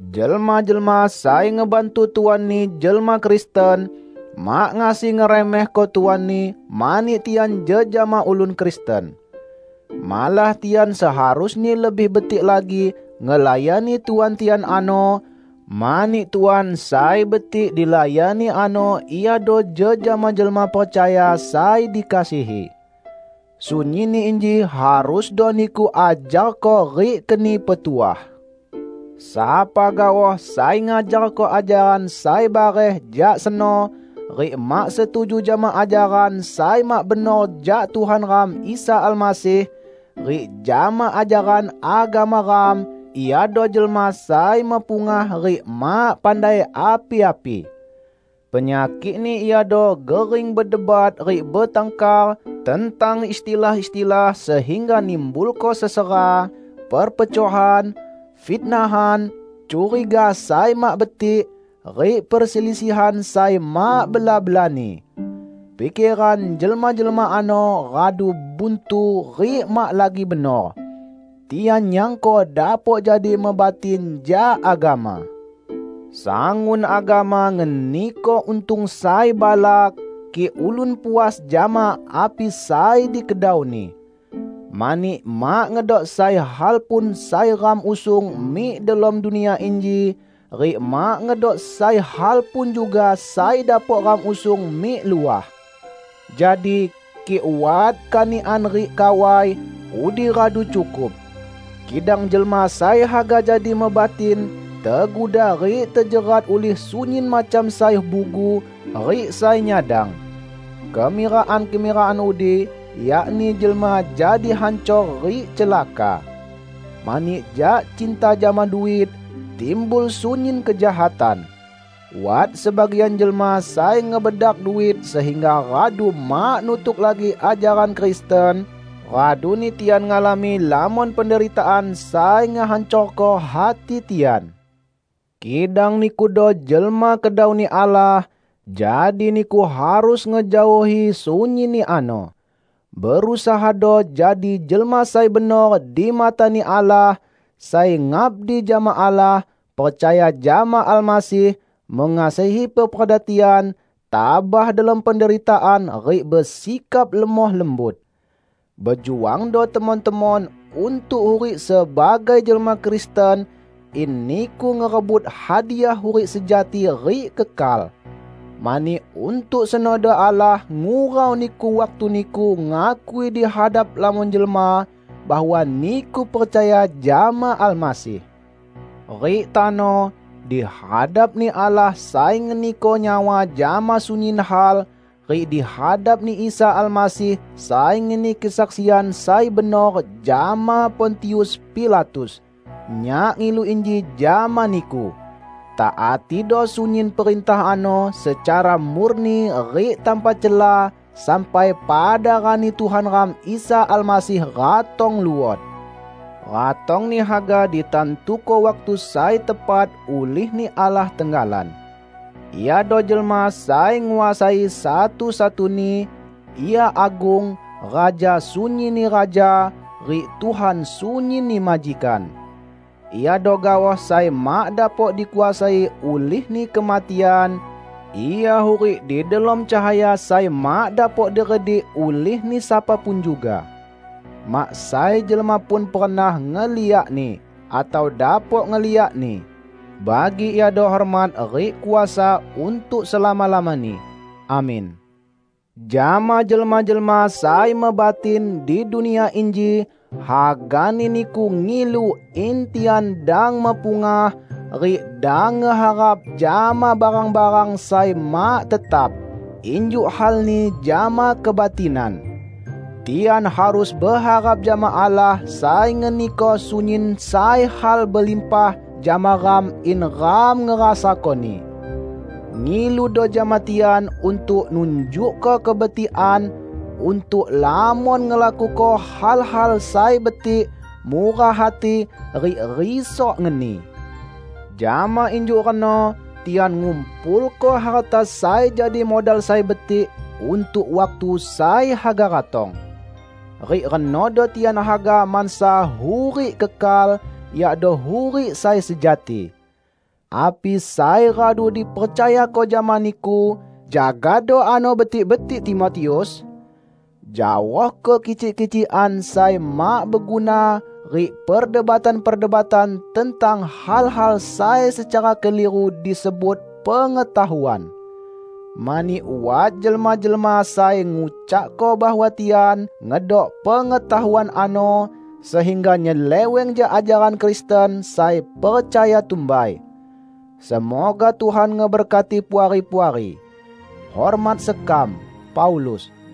Jelma-jelma sai ngebantu tuanni jelma Kristen, mak ngasi ngeremehko tuanni mani tian jejama ulun Kristen. Malah tian seharusni lebih betik lagi ngelayani tuan tian ano, mani tuan sai betik dilayani ano iado jejama jelma percaya sai dikasihi. Sunyinni inji harusdo niku ajarko rik keni petuah. Sapa gaoh sai ngajarko ajaran sai bareh jak seno rik mak setuju jama ajaran sai mak benor jak Tuhan ram Isa Almasih, rik jama ajaran agama ram, iado jelma sai mepungah rik mak pandai api-api! Penyakikni iado gering bedebat rik betangkar tentang istilah-istilah sehingga nimbulko sesera, perpecohan, fitnahan, curiga sai mak betik, rik perselisihan sai mak bela-belani. Pikeran jelma-jelma ano radu buntu rik mak lagi benor. Tian nyangko dapok jadi mebatin jak agama. Sangun agama ngeniko untung sai balak, kik ulun puas jama api sai dikedauni. Mani mak ngedok sai hal pun sai ram usung mik delom dunia inji, rik mak ngedok sai hal pun juga sai dapok ram usung mik luah. Jadi, kik wat kanikan rik kawai, udi radu cukup. Kidang jelma sai haga jadi mebatin, teguda rik terjerat ulih sunyin macam sai bugu rik sai nyadang. Kemirakan-kemirakan udi yakni jelma jadi hancor rik celaka. Mani jak cinta jama duit, timbul sunyin kejahatan. Wat sebagian jelma sai ngebedak duit sehingga radu mak nutuk lagi ajaran Kristen, raduni tian ngalami lamon penderitaan sai ngehancorko hati tian. Kidang nikudo jelma kedau-Ni Allah, jadi niku harus ngejaohi sunyinni ano. Berusahado jadi jelma sai benor di mata-Ni Allah, sai ngabdi jama Allah, percaya jama Almasih, mengasihi peperda tian, tabah delom penderitaan rik besikap lemoh lembut. Bejuangdo temon-temon untuk hurik sebagai jelma Kristen in niku ngerebut hadiah hurik sejati rik kekal. Mani untuk senodo Allah ngurau niku waktu niku ngakui di hadap lamon jelma bahwa niku percaya jama Almasih. Rik tano, di hadap-Ni Allah sai ngeniko nyawa jama sunyin hal, rik di hadap-Ni Isa Almasih sai ngeni kesaksian sai benor jama Pontius Pilatus, nyak ngilu inji jama niku: Taatido sunyin perintah ano secara murni rik tanpa cela sampai pada rani Tuhan ram Isa Almasih ratong luot. Ratong-Ni haga ditantuko waktu sai tepat ulih-Ni Allah tenggalan. Iado Jelma Sai Nguasai satu-satuni; Ia agung, Raja sunyinni raja, rik Tuhan sunyinni majikan. Iado gaoh sai mak dapok dikuasai ulihni kematian; Ia hurik di delom cahaya sai mak dapok diredik ulihni sapa pun juga. Mak sai jelma pun pernah ngeliak-Ni, atau dapok ngeliak-Ni. Bagi Iado hormat rik kuasa untuk selama-lamani! Amin. Jama jelma-jelma sai mebatin di dunia inji hagani niku ngilu in tian dang mepungah rik dang ngeharap jama barang-barang sai mak tetap -- injuk halni jama kebatinan. Tian harus beharap jama Allah sai ngeniko sunyin sai hal belimpah jama ram in ram ngerasakoni. Ngiludo jama tian untuk nunjukko kebetikan, untuk lamon ngelakuko hal-hal sai betik, murah hati, rik risok ngeni. Jama injuk reno tian ngumpulko harta sai jadi modal sai betik untuk waktu sai haga ratong. Rik renodo tian haga mansa hurik kekal, yakdo hurik sai sejati. Api sai radu dipercayako jama niku, jagado ano betik-betik, Timotius! Jaohko kicik-kicikan sai mak beguna rik perdebatan-perdebatan tentang hal-hal sai secara keliru disebut "Pengetahuan". Mani wat jelma-jelma sai ngucakko bahwa tian ngedok pengetahuan ano, sehingga nyeleweng jak ajaran Kristen sai percaya tumbai. Semoga Tuhan ngeberkati Puari-puari. Hormat sekam, Paulus